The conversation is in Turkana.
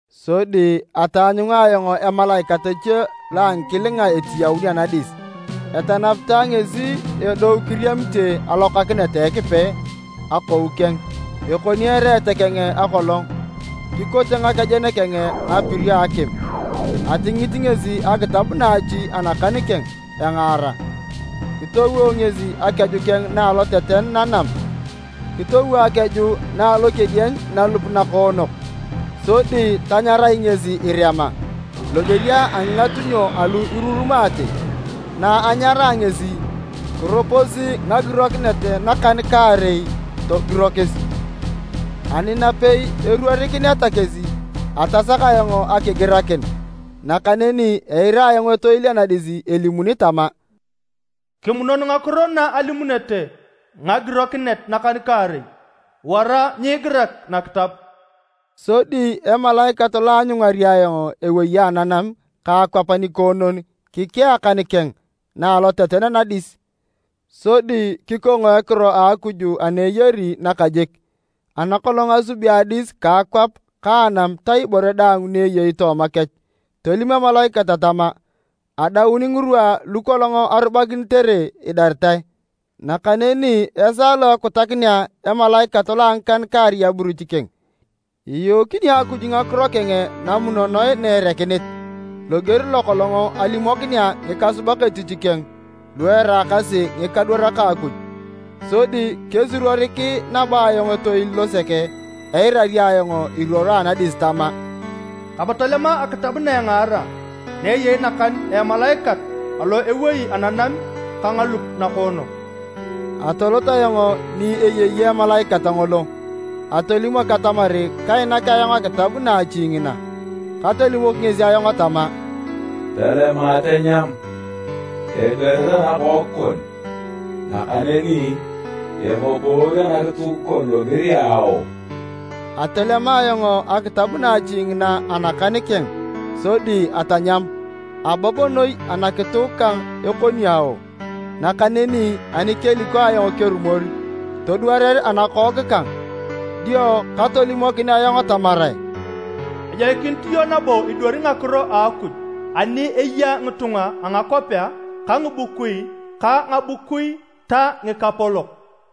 Sodi ataanyunga ayong emalaikat eche lo a ngikilinga etiyaun anadis. Etanapitae ngesi edou kiriamite alokakinet a Ekipe akou keng. Ekoni ereet keng akolong, kikote ngakejen keng ngapirio a akim. Atingit ngesi akitab naachi anakan keng, engaara. Kitowo ngesi akeju keng na a aloteten nanam, kitowo akeju na a alokedieny nalup nakoonok, sodi tanyarai ngesi irema, loger a ngingatunyo alu irurumaate. Na anyaraa ngesi, kiroposi ngagirokinet nakan-kaarei togirokis. Ani napei eruorikineta kesi, atasak ayong akigirakin. Nakaneni eira ayong etoil anadis elimuni tama, “Kimunon ngakiro na alimunete ngagirokinet nakan-kaarei, wara nyiigirak nakitab!” Sodi emalaikat lo aanyungari ayong ewei ananam ka akwap nikoonon kikea akan keng na aloteten nadis sodi kikong a ekiro a Akuj ana eyari nakajik, ana kolong asubi adis ka akwap ka anam ta ibore daang ni eyei tooma kech. Tolim emalaikat tama, “Adaun ngirwa lukolong arubakinitere idaritae! Nakaneni esaa lo ekutakinea emalaikat lo a ngikan-kaarei aburuch keng, iyookini Akuj ngakiro keng namunonoe na erekinit, loger lokolong alimokinea ngikasubak etich keng, lu eraakasi ngikadwarak a Akuj.” Sodi kesuruorik nabo ayong etoil losek eirari ayong iruoro anadis tama, “Kape tolema akitab na engaara na eyei nakan a emalaikat alo ewei ananam ka ngalup nakoonok.” Atolot ayong ni eyei emalaikat ngolo atolimok atamar kainak ayong akitab naachi ngina. Katolimok ngesi ayong tama, “Tolema tanyam, edwarer anakook kon, nakaneni eboboor anakituk kon loger a ao.” Atolema ayong akitab naachi ngina anakan keng sodi atanyam, abob noi anakituk kang ekoni ao. Nakaneni ani keliko ayong kerumor, todwarer anakook kang. Dio katolimokin ayong tamarae, “Ejoikinit iyong nabo idwari ngakiro a Akuj ani eya ngitunga a ngakwapea ka ngibukui ka ngabukui ta ngikapolok.”